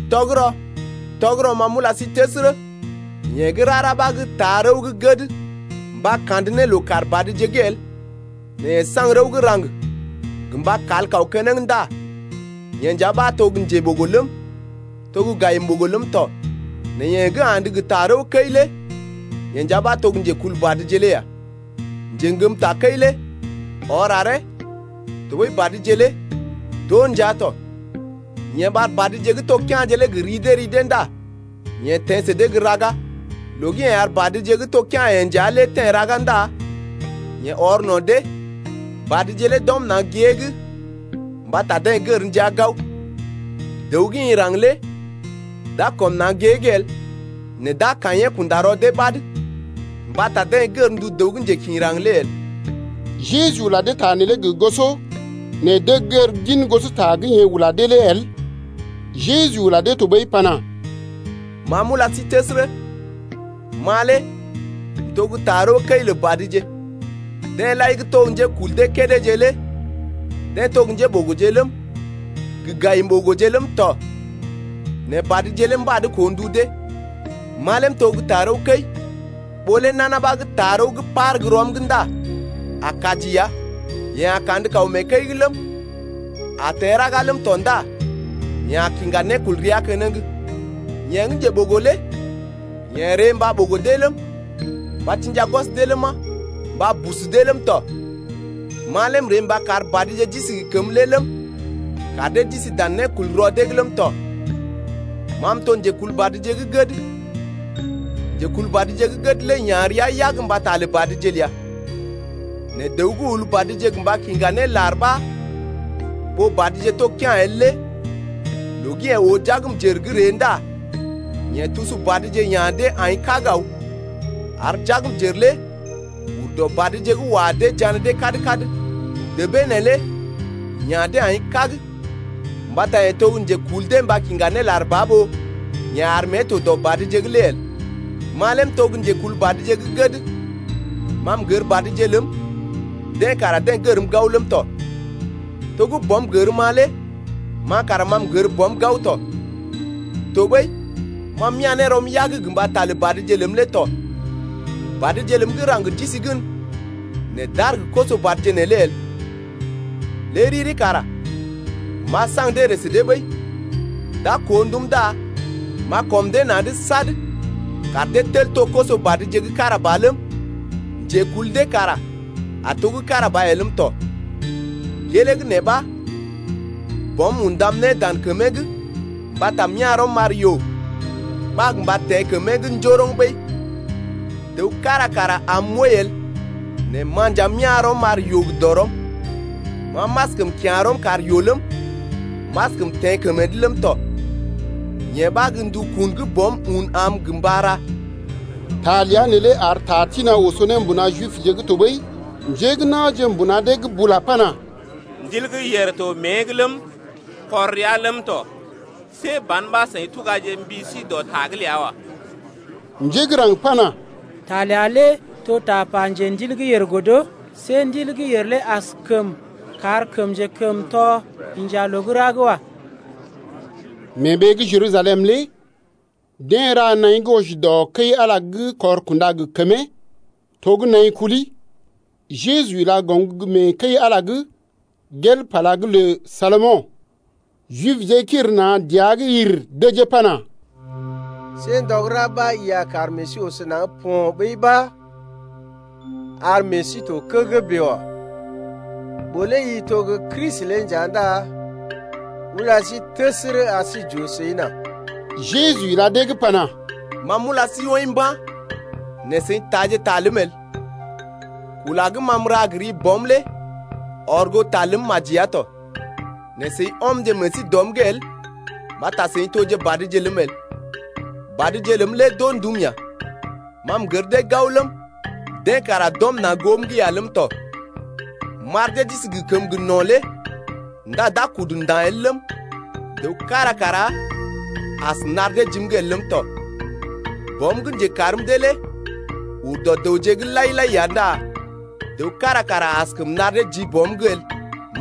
Tɔgərɔ, tɔgərɔ, ma m’ula sí təsərə, yeḛ gə́ rara ɓa gə́ taa rəw gə́ gəd mba kandə ne loo-kaar-badje’g el nɛ yeḛ saŋg rəw gə́ raŋg gə mba kal kaw keneŋ ndá yeḛ nja ɓa to gə́ njeɓogo ləm, to gə́ gayim-ɓogo ləm tɔ, Nɛ yeḛ gə́ andə gə tarəwkəi lé yeḛ nja ɓa to gə́ njekulbadje lé ya. Njeŋgəm takəi lé ɔr aree, tɔɓəi badje lé d’oo ndia tɔ. Yeḛ ɓar badje gə́ to kea̰je lé gə ri dee ri dee ndá yeḛ teḛ sə gə́ raga. Loo gə́ yeḛ ar badje gə́ to kea̰-yeḛ nja lé teḛ raga ndá yeḛ ɔr no̰ dee, badje lé d’ɔm na̰ gée’g mbata deḛ gər ndia gao. Dəw gə́ ḭ raŋg lé d’a kɔm na̰ gée’g el, nɛ d’a kaḭyee kunda rɔ dee ɓad mbata deḛ gər ndu dəw gə́ njekḭ raŋg lé el. Jeju ula dee ta neelé gə goso nɛ deḛ gər gin gosota gə́ yeḛ ula dee lé el. Jeju ula dee tɔɓəi pana: Ma m’ula sí təsərə, ma lé m’to gə́ tarəwkəi lə badje. Deḛ lai gə́ to gə́ njékul dee kédéje lé deḛ to gə́ njéɓogoje ləm, gə gayim-ɓogoje ləm tɔ, nɛ badje lé mbad koo ndu dee. Ma lé m’to gə́ tarəwkəi, ɓó lé nana ɓa gə́ taa rəw gə́ par gə́ rɔm’g ndá a kaji ya, yeḛ a kandə kaw mee kəi’g ləm, a teḛ raga ləm tɔ ndá yeḛ a kiŋga nékulrea keneŋ. Yeḛ gə́ njeɓogo lé yeḛ ree mba ɓogo dee ləm, mba tḭja gwɔs dee ləma, mba busu dee ləm tɔ. Ma lé m’ree mba kar badje d’isi gə kəmə lé ləm, kar dee d’isi dan nékulrɔ dee’g ləm tɔ. Ma m’to njekulbadje gə́ gəd. Njekulbadje gə́ gəd lé ya̰ rəa yag mbata lə badje ləa. Nɛ dəw gə́ ul badje gə mba kiŋga ne lar ɓa ɓó badje to kea̰ el lé loo gə́ yeḛ oo jagmjər gə́ ree ndá yeḛ tusu badje ya̰ dee aḭ kág aw, ar jagmjər lé ur dɔ badje’g wa dee jané dee kad-kad Débee neelé ya̰ dee aḭ kág mbata yeḛ to gə́ njekul dee mba kiŋga ne lar ba ɓó yeḛ ar mée to dɔ badje’g lé el. Ma lé m’to gə́ njekulbadje gə́ gəd. Ma m’gər badje ləm, dee kara dee gərm gao ləm tɔ. To gə́ Bɔm gərm-ma lé ma kara ma m’gər Bɔm gao tɔ. Tɔɓəi ma m’ya̰ ne rɔm yag gə mbata lə badje ləm lé tɔ. Badje ləm gə́ raŋg d’isi gən nɛ d’aar gə koso-badje’g neelé el. Lé riri kara m’a saŋg dee ree sə dee ɓəi, d’a koo ndum ndá m’a kɔm dee na̰’d sad kar dee tel to koso-badje gə́ kára ba ləm, njekul dee kara a to gə́ kára ba ya ləm tɔ. Gelee gə́ nee ɓa Bɔm undam ne dan kəmee’g mbata m’ya̰ rɔm m’ar yoo ɓa gə mba teḛ kəmee’g njoroŋ ɓəi. Dəw kára kara arm m’wəi el nɛ ma nja m’ya̰ rɔm m’ar yoo gə dɔrɔm. Ma m’askəm kya̰ rɔm kar yoo ləm, m’askəm teḛ kəmee’d ləm tɔ. Yee ɓa gə́ ndukun gə́ Bɔm un am gə mba ra ya. Ta ləa neelé ar ta tḭ-na̰ oso ne mbuna Jibje’g tɔɓəi. Njé gə́ na̰je mbuna dee’g bula pana: Ndil gə́ yèr to mée’g ləm, kɔr rəa ləm tɔ. See ban ɓa seḭ tugaje mbi sí dɔ ta’g ləa wa. Njé gə́ raŋg pana: Ta ləa lé to gə́ tapa njendil gə́ yèr godo. See ndil gə́ yèr lé askəm kar kəm njekəmtɔ inja loo gə́ ra’g wa. Mee ɓee gə́ Jerusalem lé deḛ ra naḭ gə́ wɔji dɔ Kəi-Ala gə́ kɔr kunda gə kəmee. To gə́ nai kuli. Jeju ila goŋ gə́ mee kəi-Ala’g gel pala gə́ lə Salomo̰. Jibje kiri na̰ dəa’g yir dəjee pana: See ndɔ gə́ ra ɓa i a kar meḛ sí oso naŋg po̰ ɓəi ɓa ar meḛ sí to kəgəgə bèe wa. Ɓó lé i to gə́ Kristi lé nja ndá ula sí təsərə ar sí j’oo səi nà. Jeju ila dee’g pana: Ma m’ula sí woḭ mba̰ nɛ seḭ taaje ta ləm el. Kula gə́ ma m’ra gə ri Bɔm lé ɔr goo ta ləm maji ya tɔ. Nɛ seḭ ɔmje meḛ sí dɔm’g el mbata seḭ toje badje ləm el. Badje ləm lé d’oo ndum ya. Ma m’gər dee gao ləm, dee kara d’ɔm na̰ goom’g ya ləm tɔ. M’ar dee d’isi gə kəmə no̰ lé ndá d’a kudu nda̰ el ləm, dəw kára kara as nar dee jim’g el ləm tɔ. Bɔm gə́ njekarm dee lé ur dɔ dəwje’g lai-lai ya ndá dəw kára kara askəm nar dee ji Bɔm’g el.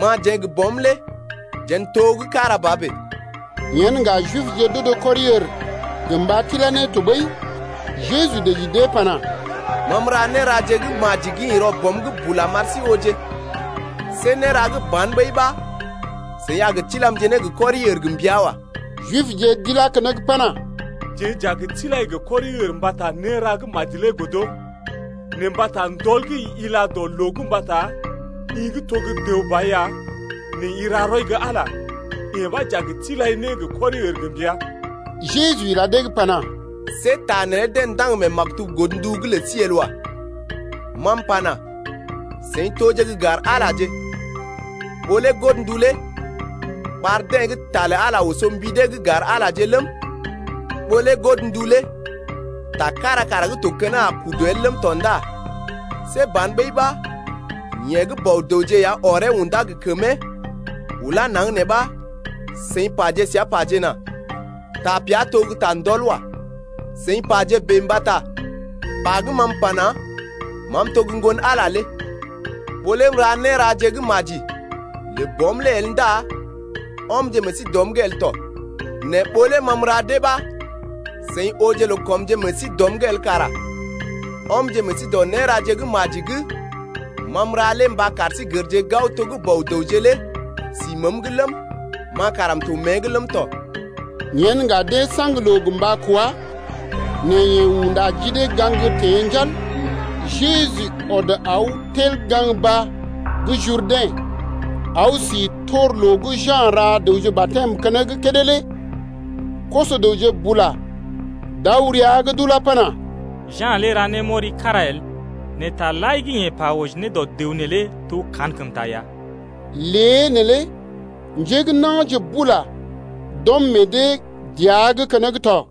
Ma jeḛ gə Bɔm lé jeḛ n’to gə́ kára ba bèe. Yen ŋga Jibje d’odo kɔri-ər gə mba tilá ne tɔɓəi. Jeju dəji dee pana: Ma m’ra néraje gə́ maji gə́ ḭ rɔ Bɔm’g bula m’ar sí ooje. See néra gə́ ba̰ ɓəi ɓa seḭ a gə tilamje ne gə kɔri-ər gə mbəa wa. Jibje d’ilá keneŋ pana: Jeḛ j’a gə tilai gə kɔri-ər mbata néra gə́ maji lé godo, nɛ mbata ndɔl gə́ i ila dɔ loo’g mbata i gə́ to gə́ dəw ba ya, nɛ i ra rɔi gə́ Ala, yee ɓa j’a tilai ne gə kɔri-ər gə mbəa. Jeju ila dee’g pana: See ta neelé deḛ ndaŋg mee maktub godndu’g lə sí el wa. Ma m’pana: Seḭ toje gə́ gar-Alaje. Ɓó lé godndu lé ɓar deḛ gə́ ta lə Ala lé oso mbi dee’g gar-Alaje ləm, ɓó lé godndu lé ta kára kara gə́ to keneŋ a kudu el ləm tɔ ndá see ban ɓəi ɓa yeḛ gə́ Bɔ-dəwje ya ɔree undá gə kəmee ulá naŋg nee ɓa seḭ paje səa pajena: Tapea to gə́ ta ndɔl wa. Seḭ paje bèe mbata pa gə́ ma m’pana: Ma m’to gə́ Ŋgon-Ala lé. Ɓó lé m’ra néraje gə́ maji lə Bɔm lé el ndá ɔmje meḛ sí dɔm’g el tɔ. Nɛ ɓó lé ma m’ra dee ɓa seḭ ooje loo kɔmje meḛ sí dɔm’g el kara ɔmje meḛ sí dɔ néraje gə́ maji gə́ ma m’ra lé mba kar sí gərje gao to gə́ Bɔ-dəwje lé sí məəm’g ləm, ma kara m’to mée’g ləm tɔ. Yen ŋga deḛ saŋg loo gə mba kwá, nɛ yeḛ unda ji dee gaŋg teḛ njal. Jeju ɔd aw tel gaŋg baa gə́ Jurdɛ̰ aw si tor loo gə́ Ja̰ ra dəwje batɛm keneŋ kédé lé. Koso-dəwje bula d’aw rəa’g d’ulá pana: Ja̰ lé ra némɔri kára el, nɛ taje lai gə́ yeḛ pa wɔji ne dɔ dəw neelé to kankəmta ya. Lée neelé njé gə́ na̰je bula d’ɔm meḛ dee dəa’g keneŋ tɔ.